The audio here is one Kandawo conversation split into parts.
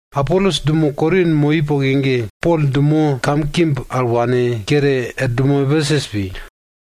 Apolos dumo Korin moi poke ge Pol dumo kamkimb al wane kere er dumo Epesus pi.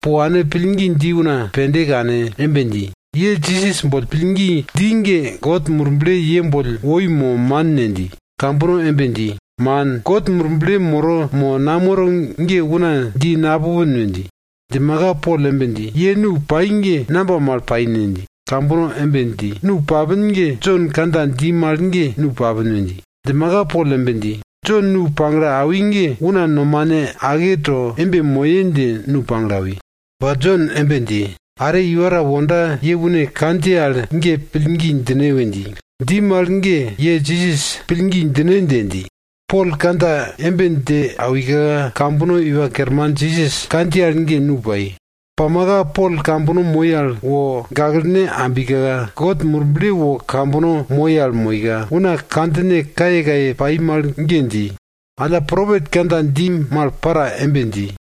Po wane pillgi dji una pende kane embe dji, ye Jisas boll pillgi dji ge, God Murble ye boll woi mo man ne? dji. Kambono embe dji, man, God Murble moro mo namoro ge una ta dji no napupin we dji. Djimaka, Pol embe dji, ye nu pai ge namba mal pai ne? dji. Kambono embe dji, nu papin ge Jon kandja dji mal ge nu papin we dji. Djimaka Pol embe dji, Jon nu pagle awi ge una nomane ake to moye dje nu pagle awi. Ba Jon embe dji, are iwa ta wonda ye une kandjiye al ge pillgi djine we dji. Dji mal ge ye Jisas pillgi djine dje dji. Pol kandja embe dje awika, kambono Iwa Kerman Jisas kandjiye al ge nu pai. Pamaka Pol kambono moi al wo gaklene ambika, God Murble wo kambono moi al moika, una kandjine kayekaye pai mal ge dji. Alla, propet kandja dji mal para embe dji.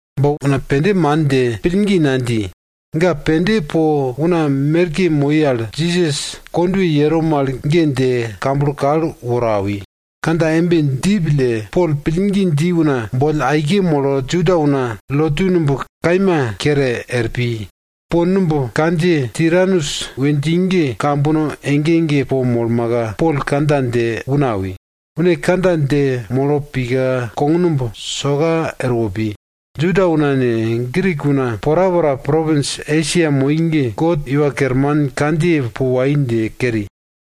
Ba una pende man dje, pillgi nadji. Ga pene po una merke moi al Jisas kondwe yero mal ge dje kamblo kal woro awi. Kandja embe dji pille Pol pillgi dji una boll aike molo Juda una lotu numb kaima kere er pi. Po numb kandjiye Tiranus we dji ge kambono ege ege po molmaka, Pol kandja dje una awi. Une kandja dje molo pika kognumb soka erwo pi. Juda una ne, Grik una porapora propins Esia moi ge, God Iwa Kerman kandjiye pa wai dje keri.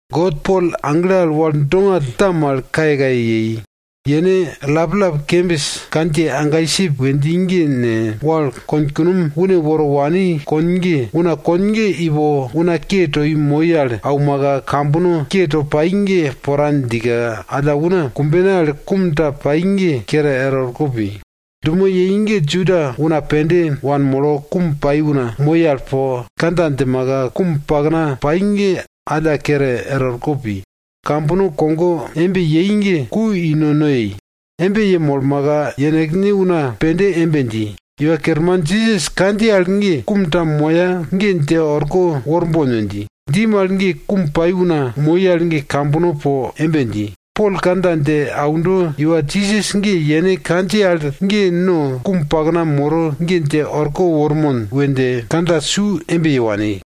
God Pol agle al wal dongall ta mal kayekaye yei. Yene allap kembis kandjiye ankisip we dji ne, wal konkunom une woro wani kon ge, una kon ge ipo una ke toi moi al aumaka, kambono ke to pai ge pora djika, alla una kumbene al kum ta pai ge kere er orko pi. Dumo yei ge Juda una pende wanmolo kum pai una moi al po kandja djimaka, kum pakna pai ge alla kere er orko pi. Kambono kogo embe yei ge ku i nono yei. Embe yemolmaka, yenekne una pende embe dji, Iwa Kerman Jisas kandjiye al ge kum ta moya ge dje orko worbon we dji. Dji mal ge kum pai una moi al ge kambono po embe dji, Pol kandja dje aundo iwa Jisas ge yene kandjiye al ge no kum pakna moro ge dje orko wormon we dje kandja su embe ye wani.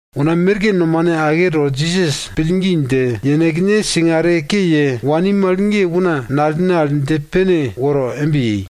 Una merke nomane ake to Jisas pillgi dje, yenekne singare ke ye wani mal ge una nalene al dje pene woro embe yei.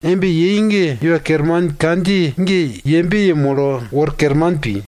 Embe yei ge Iwa Kerman kandjiye ge yembe yemolo wor kerman pi.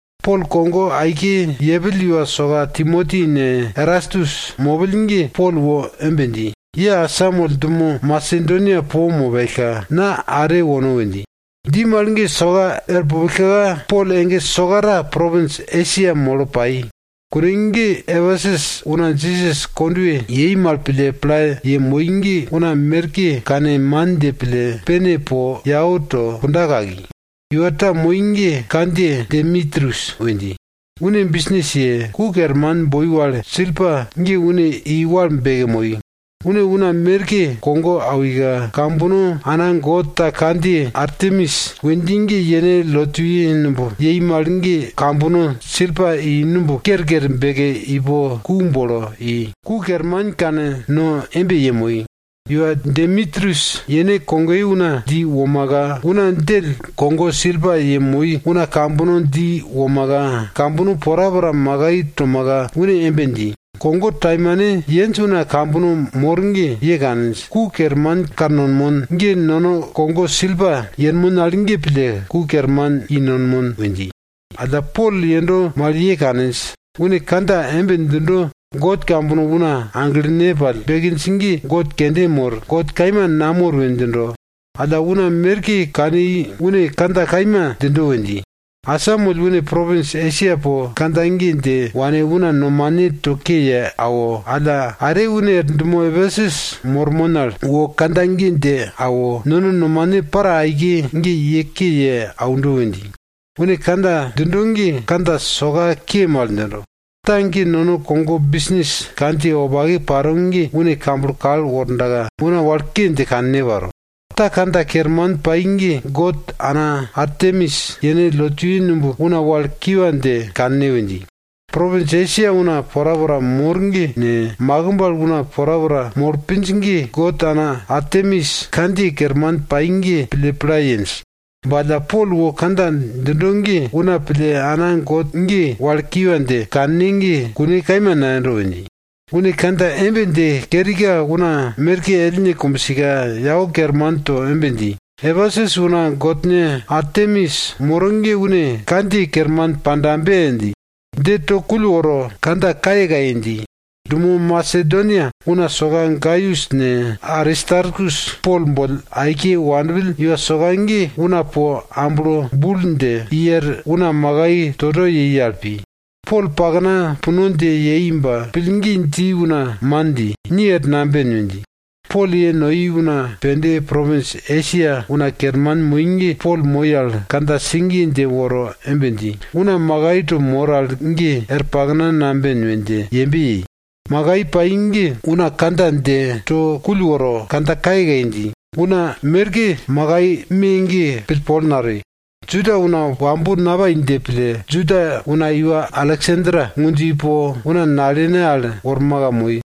Pol kogo aike yepill iwa soka Timoti ne, Erastus mopill ge Pol wo embe dji, ye asamoll dumo Masedonia po mopellka, na are wono we dji. Dji mal ge soka er pupillka, Pol ege sokarita propins Esia molo pai. Kune ge Epesus una Jisas kondwe yei mal pille pla yemoi ge una merke kane man dje pille, pene po yau to kunda kaki. Iwa ta moi ge kandjiye Demitrius we dji. Une bisnis ye, ku kerman boi wale silpa ge une i wal beke moi. Une una merke kogo awika, kambono ana god ta kandjiye Artemis we dji ge yene lotuye numb yei mal ge kambono silpa i numb kerker beke ipo ku bolo i, ku kerman kanno embe yemoi. Iwa Demitrius yene kogoye una dji womaka, una djell kogo silpa yemoi una kambono dji womaka, kambono porapora makai tomaka une embe dji, kogo taimane yenj una kambono mor ge! Ye kaninj, ku kerman kannonmon ge nono kogo silpa yenmon al ge pille ku kerman i nonmon we dji. Alla Pol yendo mal ye kaninj. Une kandja embe djindo, god kambono una aglene pall bekinj ge god kende mor, god kaima namor we djindo. Alla una merke kani une kandja kaima djindo we dji. Asamoll une propins Esia po kandja ge dje wane una nomane to ke ye awo alla, are une er dumo Epesus mormon al wo kandja ge dje awo, nono nomane para aike ge ye ke ye aundo we dji. Une kandja djindo ge kandja soka ke mal djindo. Ta ge nono kogo bisnis kandjiye wopake paro ge une kamblo kal wordaka una wal ke dje kanne paro. Ta kandja kerman pai ge god ana Artemis yene lotuye numb una wal kiwa dje kanne we dji. Propins Esia una porapora mor ge ne, makimb al una porapora molo pinj ge, god ana Artemis kandjiye kerman pai ge pille pla yenj. Ba alla Pol wo kandja djindo ge una pille ana god ge wal kiwa dje kanne ge kune kaima nayendo! we dji. Une kandja embe dje kerika una merke ellne kumbsika, yau kerman to embe dji, Epesus una godne Artemis moro ge une kandjiye kerman pandabe! dji. Dje to kull woro, kandja kayekaye dji. Dumo Masedonia una soka Gaius ne Aristarkus Pol boll aike wanpill iwa soka ge una po amblo bul dje i er una makai toto yei al pi. Pol pakna puno dje yei ba pillgi dji una man dji, ni er namben! we dji. Pol ye noi una pende propins Esia una kerman moi ge Pol moi al kandja sigiye dje woro embe dji, una makai to mor al ge er pakna namben we dje yembe yei. Makai pai ge una kandja dje to kull woro, kandja kayekaye dji. Una merke makai me ge pillpol natoi. Juda una wambo napai dje pille, Juda una iwa Aleksander ngundjo ipo una nalene al worma moi.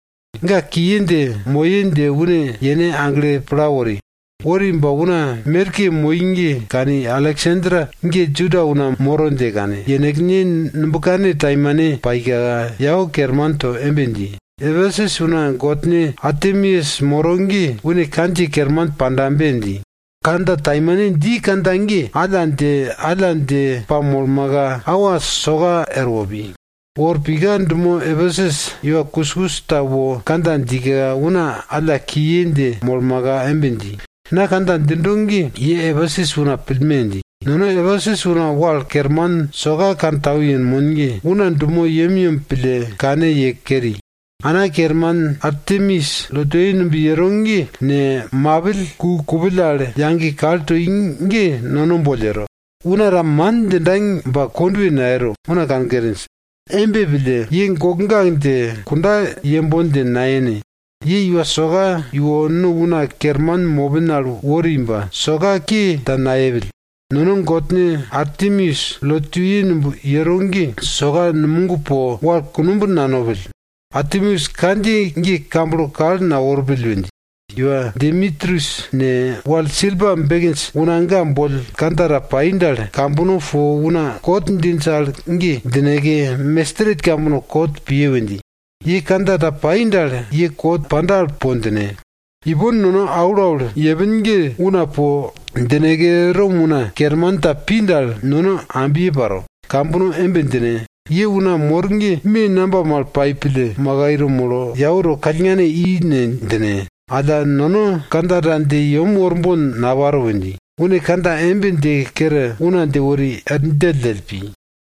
Ga kiye dje moye dje une yene agle pla wori. Wori ba una merke moi ge kani Aleksander ge Juda una moro dje kane, yenekne kandja taimane dje yau kerman to embe dji, Epesus una godne Artemis moro ge une kandjiye kerman pandabe! dji. Kandja taimane dji kandja ge, alla dje, alla dje pamolmaka awa soka erwo pi. Wo er pika dumo Epesus iwa kuskus ta wo kandja djika, una alla kiye dje molmaka embe dji, na kandja djindo ge ye Epesus una pillme! dji. Nono Epesus una wal kerman soka kantau yenmon ge una dumo yemyem pille kane ye keri. Ana kerman Artemis lotuye numb yero ge ne, mapill ku kupill al yage kal toi ge nono boll yero, una ta man djinda ba kondwe nayero, una kankerinj. Embe pille, ye gokgak dje, kunda yembon dje nayene! Ye iwa soka iwo no una kerman mopin al wori ba, soka ke ta nayepill. Nono godne Artemis lotuye numb yero ge soka numog po wal kunumb nanopill, Artemis kandjiye ge kamblo kal naworpill we dji. Iwa Demitrius ne, wal silpa bekinj una ga boll kandja ta pai dal, kambono po una kot djinj al ge djineke, mestret kambono kot piye we dji. Ye kandja ta pai dal, ye kot panda al po djine. Ipon nono aulaul yepin ge una po djineke, Rom una kerman ta pi dal, nono ambye paro. Kambono embe djine, ye una mor ge me namba mal pai pille makai to molo, yau to kallngane i ne? djine. Alla, nono kandja ta dje yem worbon naparo we dji. Une kandja embe dje kere una dje wori er djelldjell pi.